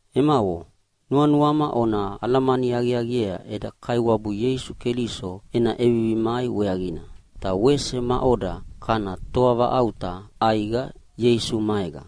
Emavo, nuanuama ona alamani aqiaqiea eda Kaiwabu Ieisu Keliso ena ʼevivi mai weaqina, ta wese maʼoda kana toavaʼauta ʼaiqa Ieisu maega.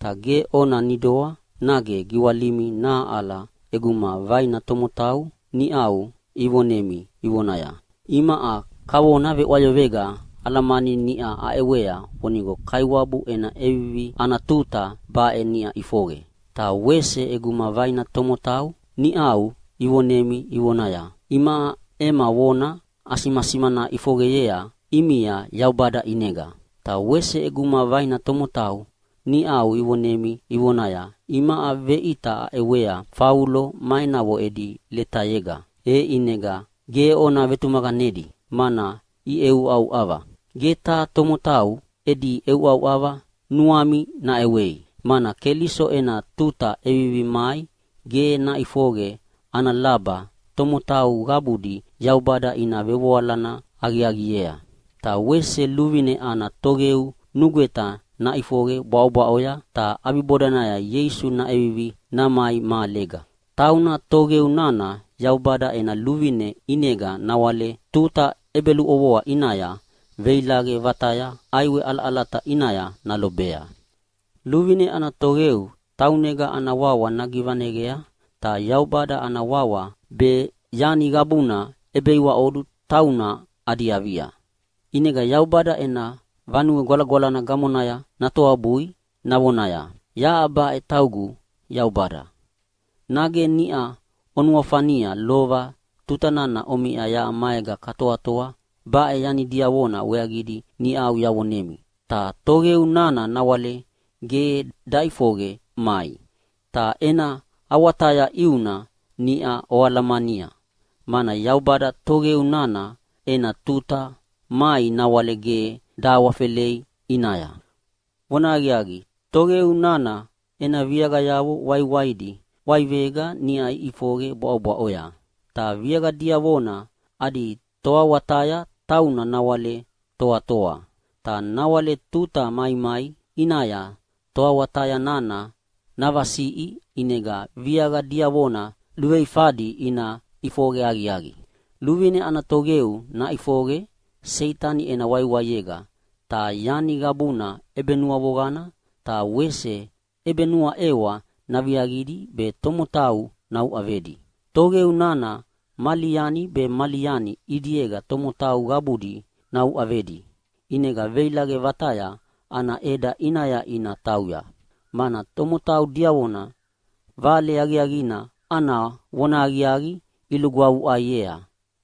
Ta ge ona nidoa nage giwalimi nahaʼala ʼeguma vaina tomotau niʼau ivonemi ivonaya, “Imaʼa kavona veʼwayoqega alamani niʼa aʼewea vonigo Kaiwabu ena ʼevivi ana tuta baʼe niʼau ʼifoqe.” Ta wese ʼeguma vaina tomotau niʼau ivonemi ivonaya, “Imaʼa ema vona asimasimana ʼifoqeyea ʼimia Yaubada ʼinega.” Ta wese ʼeguma vaina tomotau niʼau ivonemi ivonaya, “Imaʼa veʼita aʼewea Faulo ma enavo edi letayega.” E ʼinega ge ona vetumaqanedi, mana iʼeʼeuʼauʼava. Gebu taha tomotau edi ʼeuʼauʼava nuami naʼewei, mana Keliso ena tuta ʼevivi mai ge naʼifoqe ana laba tomotau qabudi Yaubada ina vevoalana aqiaqiea. Ta wese luvine ana toqeu nugweta naʼifoqe bwaʼobwaʼoya, ta ʼabibodanaya Ieisu naʼevivi namai mahalega. Tauna toqeu nana Yaubada ena luvine ʼinega nawale tuta ʼebeluʼovoa ʼinaya veilaqe vataya ʼaiwe ʼalaʼalata ʼinaya nalobea. Luvine ana toqeu taunega ana wawa nagivaneyea, ta Yaubada ana wawa be yani qabuna ʼebeiwaʼodu tauna adi avia. ʼInega Yaubada ena Vanue Gwalagwalana gamonaya natoabui navonaya, “Yaʼa baʼe taugu Yaubada.” Nage niʼa onuafania lova tuta nana omiʼa yaʼa maega katoatoa baʼe yani diavona weaqidi niʼau yavonemi. Ta toqeu nana nawale ge daʼifoqe mai. Ta ena awataya ʼiuna niʼa oalamania, mana Yaubada toqeu nana ena tuta mai nawale ge dahawafelei ʼinaya. Vonahaqiaqi, toqeu nana ena viaqayavo waiwaidi ʼwaivega niʼau iʼifoqe bwaʼobwaʼoya. Ta viaqa diavona adi toawataya tauna nawale toatoa. Ta nawale tuta maimai ʼinaya toawataya nana navasiʼi, ʼinega viaqa diavona luveifadi ina ʼifoqe aqiaqi. Luvine ana toqeu naʼifoqe Seitani ena waiwaiega ta yani qabuna ʼebenuavoqana ta wese ʼebenuaʼewa naviaqidi be tomotau nauʼavedi. Toqeu nana mali yani be mali yani ʼidiega tomotau qabudi nauʼavedi, ʼinega veilaqe vataya ana ʼeda ʼinaya ina tauya, mana tomotau diavona Vale Aqiaqina ana vonahaqiaqi ilugwavuʼaiea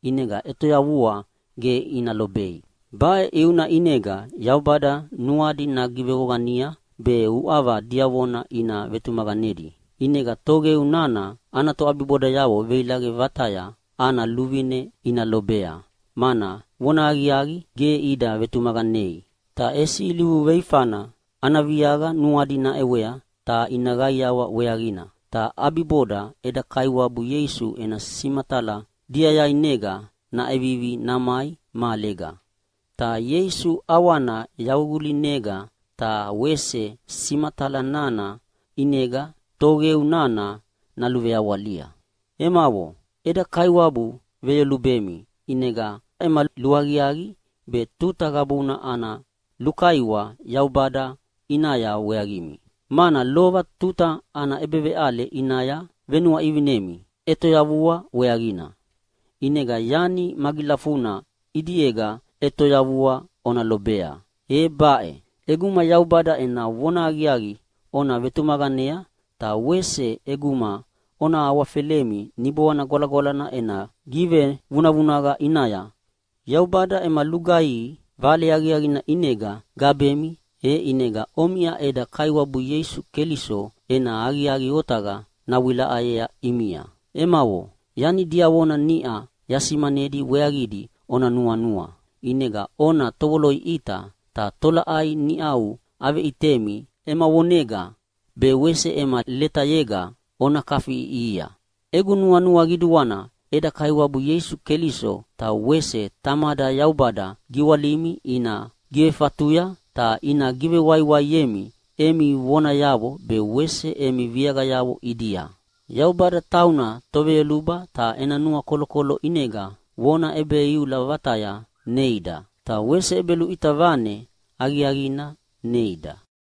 ʼinega ʼetoyavua ge ina lobei. Baʼe ʼiuna ʼinega Yaubada nuadi nagivevoqania be uʼava diavona ina vetumaqanedi. ʼInega toqeu nana ana toʼabibodayavo veilaqe vataya ana luvine ina lobea, mana vonahaqiaqi ge ida vetumaqanei, ta ʼesi ilivu luveifana ana viaqa nuadi naʼewea ta ina qaiawa weaqina. Ta ʼabiboda eda Kaiwabu Ieisu ena simatala diayainega naʼevivi namai mahalega. Ta Ieisu ʼawana yaququlinega ta wese simatala nana ʼinega toqeu nana naluveawalia. Emavo, eda Kaiwabu veyolubemi ʼinega ama luaqiaqi be tuta qabuna ana lulukaiwa Yaubada ʼinaya weaqimi, mana lova tuta ana ʼebeveʼale ʼinaya venuaʼivinemi ʼetoyavua weaqina. ʼInega yani magilafuna ʼidiega ʼetoyavua ona lobea, e baʼe: ʼEguma Yaubada ena vonahaqiaqi ona vetumaqanea, ta wese ʼeguma ona awafelemi Niboana Gwalagwalana ena givevunavunaqa ʼinaya. Yaubada ema lugaihi Vale Aqiaqina ʼinega gabemi, e ʼinega omiʼa eda Kaiwabu Ieisu Keliso ena aqiaqi otaqa navewilaʼayea ʼimia. Emavo, yani diavona niʼa yasimanedi weaqidi ona nuanua. ʼInega ona tovoloʼiʼita ta tolaʼai niʼau aveʼitemi ema vonega be wese ema letayega ona kafiʼiʼihia. Egu nuanua qiduana eda Kaiwabu Ieisu Keliso ta wese Tamada Yaubada giwalimi ina givefatuya ta ina givewaiwaiemi emi vonayavo be wese emi viaqayavo ʼidia. Yaubada tauna Toveyoluba ta ena nuakolokolo ʼinega vona ʼebeiula vataya neida, ta wese ʼebeluʼita vane aqiaqina neida.